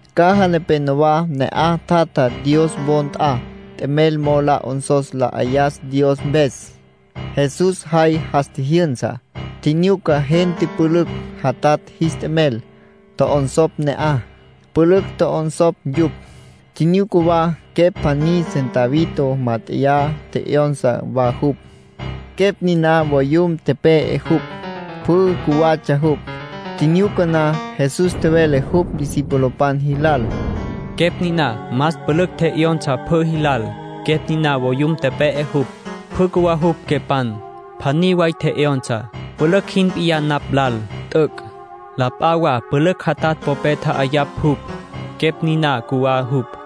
Caja nepenowá ne'aj tjatja Dios wo nt'a t'emel mo'o la 'onsos la 'ayas Dios mpes. Jesús jay jas tjijyünsa, tjinyuca gente pülücj jatatj jis t'emel tjo'onsopj ne'aj. Pülücj tjo'onsopj yupj. Tjinyuca wa quepj pjaní centavito mát'eya tje'yonsa wa jupj. Quepj niná voyum tepe'e jupj. Pjü cjuwatsja jupj. Tjinyuca na, Jesús tjevele jupj discipulopan jilal: —Quepj niná más pülücj tje'yonsa pjü jilal. Quepj niná voyum tepe'e jupj. Pjü cjuwá jupj, quepan. Pjaní way tje'yonsa, pülücj jin p'iyá napj lal. T'üc'. La p'a wa pülücj jatatj popé tja'ayapj yupj. Quepj niná cjuwá jupj.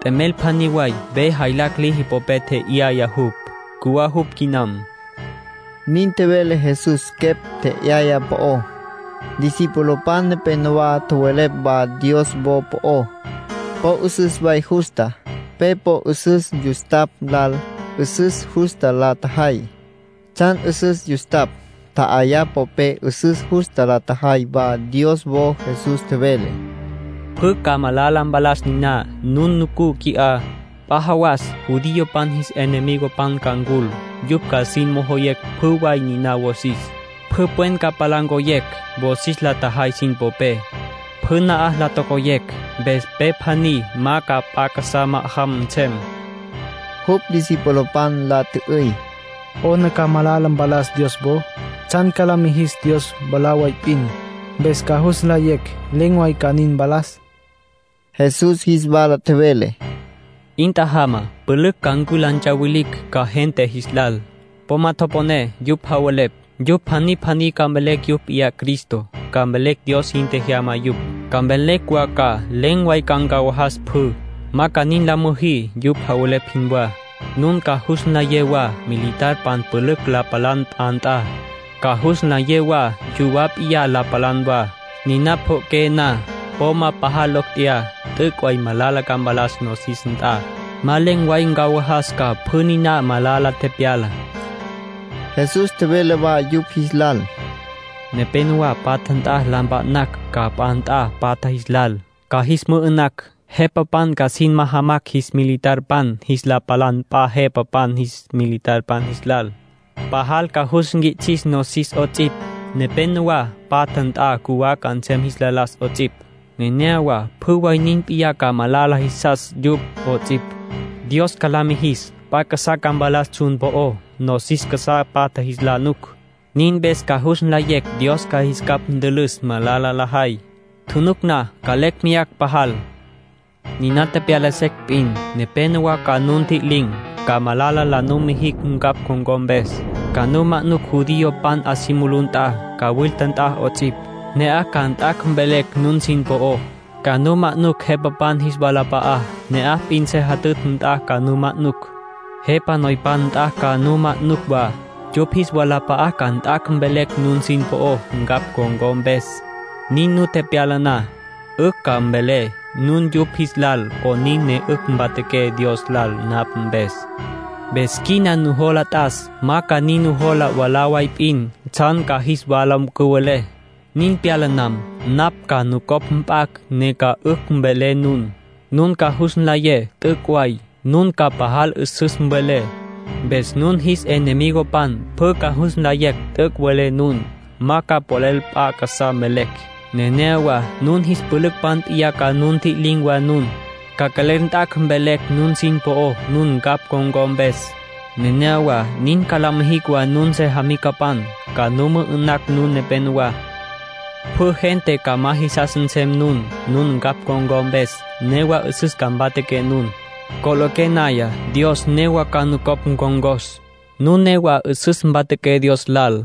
T'emel pjaní way ve jaylacj liji popé tje'yaya jupj. Cjuwá jupj quinam —nin tjevele Jesús quepj tje'yaya po'ó. Discipulopan nepénowa tjowelepj wa Dios wo po'ó. —Po 'üsüs way justa —tjowelepj—. Pe po 'üsüs yustapj lal 'üsüs justa la tjajay. Tsjan 'üsüs yustapj tja'ayapj popé 'üsüs justa la tjajay wa Dios wo. Jesús tjevele: —Pjü ca malala mpalas niná nun nucú qui'á. P'a jawas judiopan jis enemigopan ca ncul. Yupj ca sin mojoyecj pjü way niná wosis. Pjü pwen ca palá la ncoyecj, wosis la tjajay sin popé. Pjü na'aj ca la ncoyecj, mpes pe pjaní ma ca p'a casá ma'ajam nsem —tjevele Jesús. Jupj discipulopan la tjü'üy: —¿'Ona ca malala mpalas Dios wo? ¿Tsjan ca la mijis Dios mwalá way p'in, mpes ca jus nlayecj len̈ way ca nin mpalas? Jesús jis wala tjevele: —'In tjajama. Pülücj ca ncul la ntsawilicj ca gente jis lal. Po ma toponé yupj javelepj. Yupj pjaní pjaní ca mvelecj yupj p'iyá Cristo. Ca mvelecj Dios sin tjejyama yupj. Ca mvelecj wa ca len̈ way ncawajas pjü. Ma ca nin la müjí yupj javelepj jinwá. Nun ca jus nlayé wa militarpan pülücj la palan p'a nt'a. Ca jus nlayé wa yuwá p'iyá la palan wa. Niná pjo'oqué na, po ma pajal locj tjeyá. T'üc' way malala ca mpalas nosis nt'a. Ma len̈ way ncawajas ca pjü niná malala tepyalá. Jesús tjevele wa yupj jis lal: —Nepénowa patja nt'a la mpa'nacj ca p'a nt'a patja jis lal. Ca jis mü'ü'nacj. Jepapan ca sin majamacj jis militarpan jis la palan p'a jepapan jis militarpan jis lal. Pajal ca jus nquits'is nosis 'ots'ipj. Nepénowa patja nt'a cjuwá ca nsem jis la las 'ots'ipj. Nenéyawa pjü way nin p'iyá ca malala jisas yupj 'ots'ipj. Dios ca la mijis p'a casá ca mpalas tsjun po'ó, nosis casá patja jis la nuc. Nin mpes ca jus nlayecj Dios ca jis capj ntülüs malala lajay. Tjunuc na ca lacj meyacj pajal. ”Niná tepyala secj p'in, nepénowa ca nu ntji'lin̈. Ca malala la nu mijicj ncapj con̈có mpes. Ca nu manucj judiopan 'a si mulú nt'a, cawilta nt'a 'ots'ipj. Ne'aj ca jat' mvelecj nun sin po'ó. Ca nu manucj jepapan jis walap'a'á. Ne'aj p'in se jütütj nt'a ca nu manucj. Jepa noypan nt'a ca nu manucj wa. Yupj jis walap'a'a ca jat' mvelecj nun sin po'ó ncapj con̈có mpes. Nin nu tepyala na, 'ücj ca mvelé nun yupj jis lal 'onin ne 'ücj potjaqué Dios lal napj mpes. Mpes quina nujola t'as ma ca nin nujola mwalá way p'in tsjan ca jis wala cüwelé. Nin pyala nam, napj ca nucopj mp'acj ne ca 'ücj mvelé nun. Nun ca jus nlayé t'üc' way. Nun ca pajal 'üsüs mvelé, mpes nun jis enemigopan pjü ca jus nlayecj t'üc' welé nun. Ma ca polel p'a casá mvelecj. ”Nenéyawa nun jis pülücpan p'iyá ca nu ntji'lin̈ wa nun, ca quelel jat' mvelecj nun sin po'ó nun ncapj con̈có mpes. Nenéyawa nin ca la mijicj wa nun sejamicapan. Ca nu mü'ü'nacj nun nepenowá. Pjü gente ma ca jisas nsem nun, nun ncapj con̈có mpes. Newa 'üsüs ca mpatjaqué nun. Co'liqué naya, Dios newa ca nucopj ncon̈cos. Nun newa 'üsüs ca mpatjaqué Dios lal.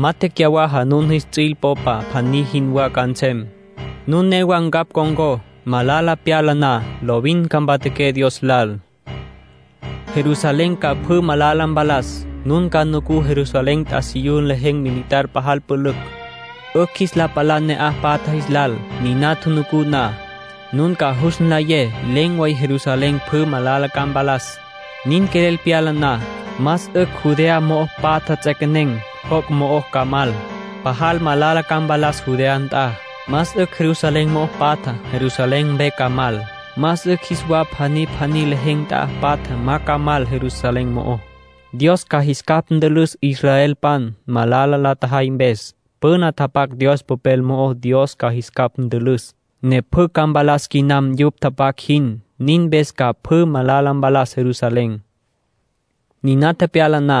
Ma tecyawaja nun ts'üil popa pjaní jinwá ca nsem. Nun newa ncapj con̈có malala pyala na, lovin ca mpatjaqué Dios lal. ”Jerusalén ca pjü malala mpalas. Nun ca nucú Jerusalén t'asiyú lejen̈ militar pajal pülücj, 'ücj jis la palan ne'aj patja jis lal. Niná tjunucú na, nun ca jus nlayé len̈ way Jerusalén pjü malala ca mpalas. Nin quelel pyala na, más 'ücj Judea mo'o patja ts'equenen̈, joc' mo'o ca mal. Pajal malala ca mpalas Judea nt'a. Más 'ücj Jerusalén mo'o patja Jerusalén mpe ca mal. Más 'ücj jis wa pjaní pjaní lejen̈ nt'a patja ma ca mal Jerusalén mo'ó. Dios ca jis capj ntülüs israelpan, malala la tjajay mpes. Püna tapac Dios Popel mo'ó Dios ca jis capj ntülüs, ne pjü ca mpalas quinam yupj tapac jin. Nin mpes ca pjü malala mpalas Jerusalén. ”Niná pyala na,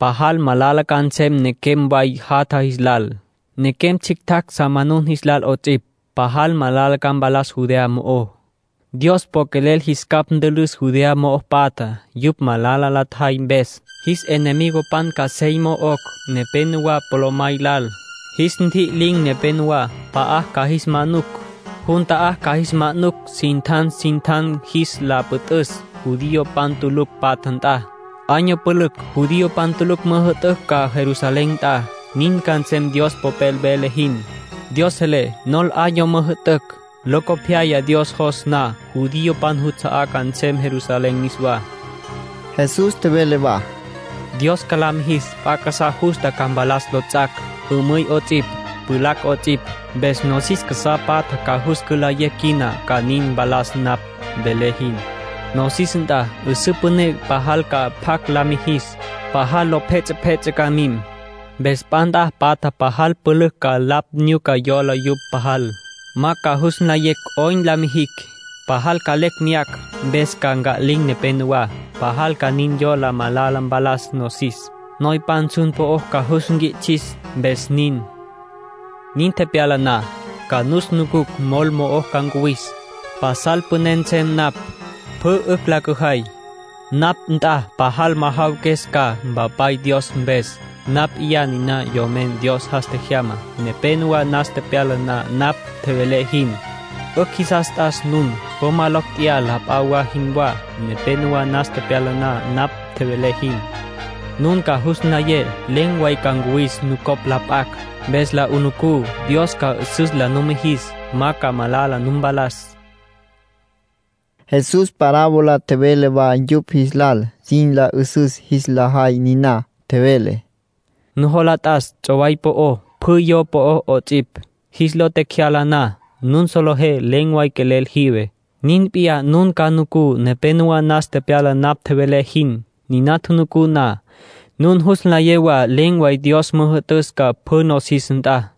pajal malala ca nsem nequem way jatja jis lal, nequem tsjictjacj sa manun jis lal 'ots'ipj. Pajal malala ca mpalas Judea mo'ó. Dios po quelel jis capj tyüla Judea mo'o patja, yupj malala la tjajay mpes. Jis enemigopan ca sey mojo'ocj nepenowá polomay lal. Jis ntji'lin̈ nepenowá, p'a'á ca jis manucj. Jun ta'á ca jis manucj, sin tjan, sin tjan jis la püt'üs, judiopan tulucj patja nt'a. Año pülücj judiopan tulucj müjü'tücj ca Jerusalén nt'a. Nin ca nsem Dios Popel vele jin. Dios selé nol año müjü'tücj. Locopyaya, Dios jos na, judiopan juts'a'á ca nsem Jerusalén niswá. Jesús tjevele wa: —Dios ca la mijis p'a casá justa ca mpalas lots'ac', mümüy 'ots'ipj, pjulacj 'ots'ipj, mpes nosis casá patja ca jus cülayecj quina ca nin mpalas napj velé jin. Nosis nt'a 'üsǘ püné pajal ca mpjac ca la mijis, pajal lo pjets'epjets'e ca mim. Mpes p'a nt'a patja pajal pülücj ca lapj nyuca yola yupj pajal. Ma ca jus nlayecj 'oyn la mijicj. Pajal ca lacj meyacj, mpes ca nca'lin̈ nepenowá, pajal ca nin yola malala ca mpalas nosis. Noypan tsjun po'ó ca jus nquits'is, mpes nin. Nin tepyala na, ca nus nucucj, mol mo'o ca ncuwis. Pasal püné nsem napj, pjü 'ücj la cüjay. Napj nt'a pajal majawaques ca Mpapay Dios mpes. Napj p'iyá niná Yomen Dios jas tjejyamá —tjevele Jesús. —Nepénowa nas tepyala na napj tjevelé jin, 'ücj jisas t'as nun. Po ma locj tjeyá la p'a wa jinwá. Nepénowa nas tepyala na napj tjevelé jin, nun ca jus nlayé len̈ way ca ncuwis nucopj la p'acj. Mpes la 'unucú Dios ca 'üsüs la numijis, ma ca malala nu mpalas —tjevele Jesús. Jesús parábola tjevele wa yupj jis lal sin la 'üsüs jis la jay niná. Tjevele: —Nujola t'as ts'oway po'ó, pjü yo po'ó 'ots'ipj. Jis lo tecyala na, nun solejé len̈ way quelel jive. Nin p'iyá nun ca nucú nepénowa nas tepyala napj tjevelé jin. Niná tjunucú na, nun jus nlayé wa len̈ way Dios müjü'tüs ca pjü nosis nt'a.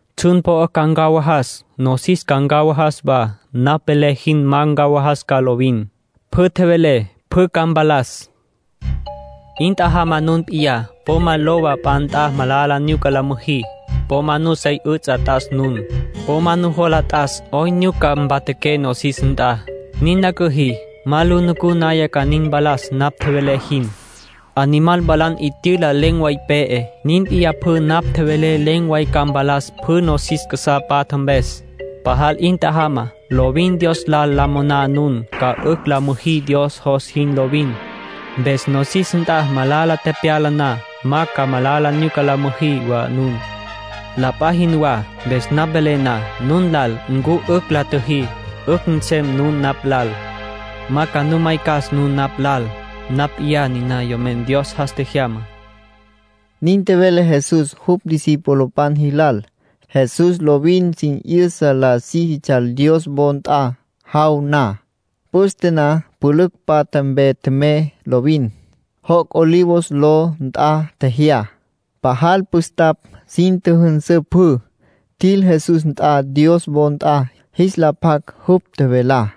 Tsjun po'ó ca ncawajas, nosis ca ncawajas wa. Napj velé jin ma ncawajas ca lovin. Pjü tjevelé, pjü ca mpalas. ”'In tjajama nun p'iyá. Po ma lowa p'a nt'a malala nyuca la müjí. Po ma nun sey 'üts'a t'as nun. Po ma pajal nujola t'as 'oyn nyuca mpatjaqué nosis nt'a. Nin la cüjí, ma lu nucú naya ca nin mpalas napj tjevele jin. Animal walan 'ityüla len̈ way pe'e. Nin p'iyá pjü napj tjevelé len̈ way ca mpalas pjü nosis casá patja mpes. Pajal 'in tjajamá. Lovin Dios lal la moná nun ca 'ücj la müjí Dios jos jin lovin. Mpes nosis nt'a malala tepyala na, ma ca malala nyuca la müjí wa nun, la p'a jinwá. Mpes napj velé na nun lal ncu 'ücj la tjüjí, 'ücj nsem nun napj lal. Ma ca nu maycas nun napj lal. Napj p'iyá niná Yomen Dios jas tjejyamá —nin tjevele Jesús jupj discipulopan jilal. Jesús lovin sin 'yüsa la síjitsja Dios wo nt'a jaw na. Püste na pülücj patja mpe tjemey lovin. Joc' Olivos ló nt'a tjejyá. Pajal püstapj sin tjüjünsüpj pjü, tjil Jesús nt'a Dios wo nt'a, jis la pjac jupj tjevelá.